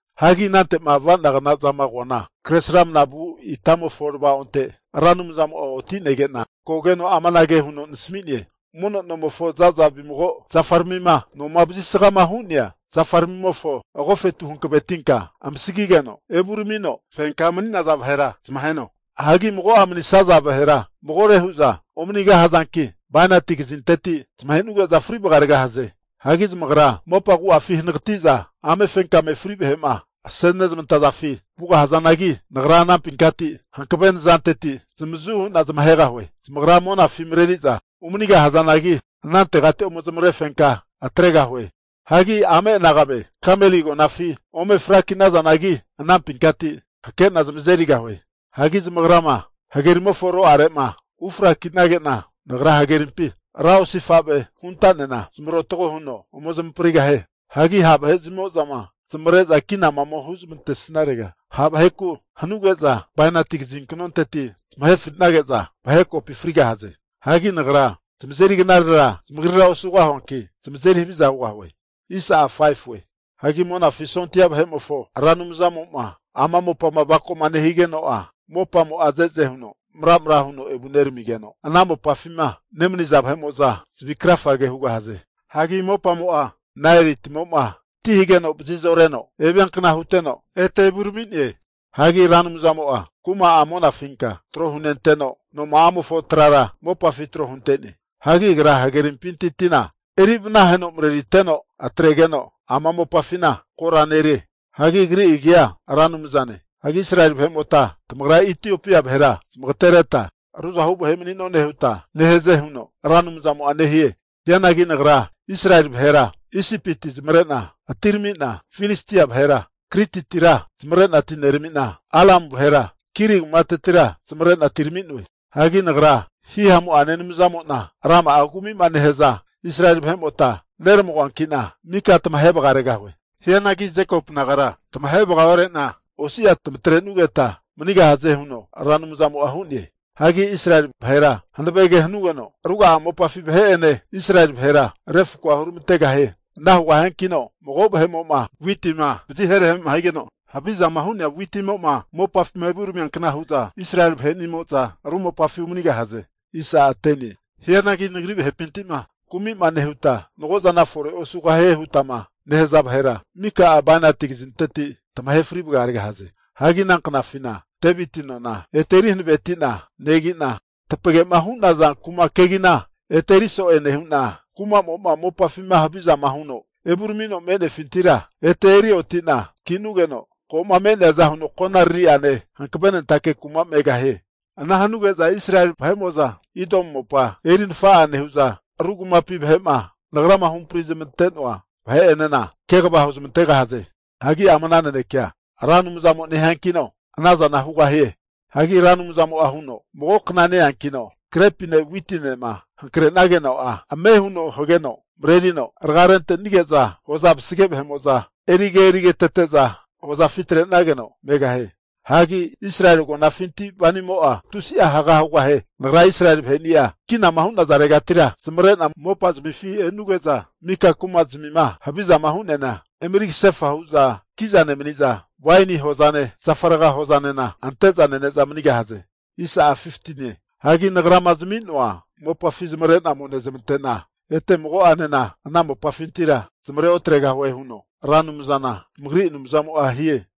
Hagi anante'ma avanagna zama koana, kresramana vu itamofo tavaonte Ra Anumzamo'a otinege'na kogeno amanage huno nasami'ne, mono nomofo zaza vimago zafaramima noma vazisgama hu'nea zafaramimofo agofetu hankavetinka amasagigeno evuramino fenkama mani'naza vahera zamaheno. Hagi mago'a manisaza vahera magore huza omanigahazanki bainati kazinteti zamahe'nuge'za fri vagaregahaze. Hagi zamagra mopa agu'afi hanagati'za amefenkame fri vahe'ma asenezmantafi vugahazanagi, Nagra anampinkati hankave nazanteti zamavazu hu'na zamahegahue. Zamagra monafi mareriza umani'gahazanagi, anantegati ome zamavarefenka atregahue. Hagi amenagame Kameli agonafi ome fraki'nazanagi, anampinkati hakena zamazerigahue. Hagi zamagrama hagerimofo ro'are'ma ufrakinage'na, nagra hagerimpi ra osifave hunta'nena zamarotago huno ome zamaprigahie. Hagi ha' vahe'zmimo'zama zamavare'za kinama ome huzmantesnarega, ha' vaheku hanuge'za bainati kazinknonteti zamahe fri'nage'za, vahe kopi frigahaze. Hagi Nagra zamazeri knarera zamagrira osugahuanki, zamazeri haviza hugahue. Hagi Monafi sondia vahe'mofo Ra Anumzamo'ma ama mopama avako'ma nehigeno'a, mopamo'a ze'ze huno maramra huno evuneramigeno, ana mopafima nemaniza vahe'mo'za zavi krafage hugahaze. Hagi mopamo'a Naeli timo'ma ti hageno vazi'zoreno eviankna huteno ete evurami'ne. Hagi Ra Anumzamo'a kuma'a monafinka tro hunenteno, noma'amofo trara mopafi tro hunte'ne. Hagi Agra hagerimpinti tina eri vanaheno mareriteno, atregeno ama mopafina kora nerie. Hagi Agri agia Ra Anumzane. Hagi Israeli vahe'mota tamagra Itiopia vahera zamagatereta ruzahu vahe mani'none huta nehaze huno Ra Anumzamo'a nehie. Hianagi Nagra Israeli vahera Isipiti zamavare'na atirami'na, Filistia vahera Krititira zamavare'na atinerami'na, Aramu vahera Kiri kumatetira zamavarena atirami'noe. Hagi Nagra Hihamu'ane Anumzamo'na rama'a kumi'ma nehaza Israeli vahe'mota neramagoankina, mika tamahe vagaregahue. Hianagi Jekopu nagara tamahe vagaore'na osi'a tamatre'nugeta manigahaze huno Ra Anumzamo'a hu'ne. Hagi Israeli vahera hanave ke hanugeno, ruga'a mopafi vahe'ene Israeli vahera refakoa huramantegahie. Ana hugahiankino mago vahe'mo'ma witima vazi herehema higeno, havizama hu'nea witimo'ma mopafi evuramiankna hu'za Israeli vahe'nimo'za ru mopafi umanigahze. Hianagi nagri vahepinti'ma kumima nehuta, mago'zana fore osugahie hutama nehaza vahera mika'a bainati kazinteti tamahe fri vagaregahaze. Hagi ana knafina Deviti nona ete eri hanavetina negi'na, tapagema hu'naza kuma kegina ete eri so'e nehu'na, kumamo'ma mopafima havizama huno evuramino me'nefintira ete eri oti'na ki'nugeno, ko'ma me'neaza huno konaririane hankavenentake kuma megahie. Ana hanuge'za Israeli vahe'mo'za Idomu mopa eri nafa'a nehu'za, ru kumapi vahe'ma nagrama huhampri zamante'noa vahe'enena kegava huzmantegahaze. Hagi ama ana nanekea Ra Anumzamo nehiankino, ana zana hugahie. Hagi Ra Anumzamo'a huno, Mago kna ne-eankino grepine witinema hankre'nageno'a ame huno hageno marerino raga rente'nige'za hoza vazage vahe'mo'za erige erigetete'za hozafi atrenageno megahie. Hagi Israeli agonafinti wainimo'a tusi'a haga hugahie. Nagra Israeli vaheni'a kinama hu'nazaregati zamavarena mopazamifi e'nuge'za, mika kuma'zmima havizama hu'neana emeri kasefa hu'za ki'za nemaniza, waini hozane, zafa raga hozanena ante'za nene'za manigahaze. Hagi Nagrama zami'noa mopafi zamavare'na ome nezamante'na, ete mago'anena ana mopafintira zamavare otregahue, huno Ra Anumzana tamagri Anumzamo'a hie.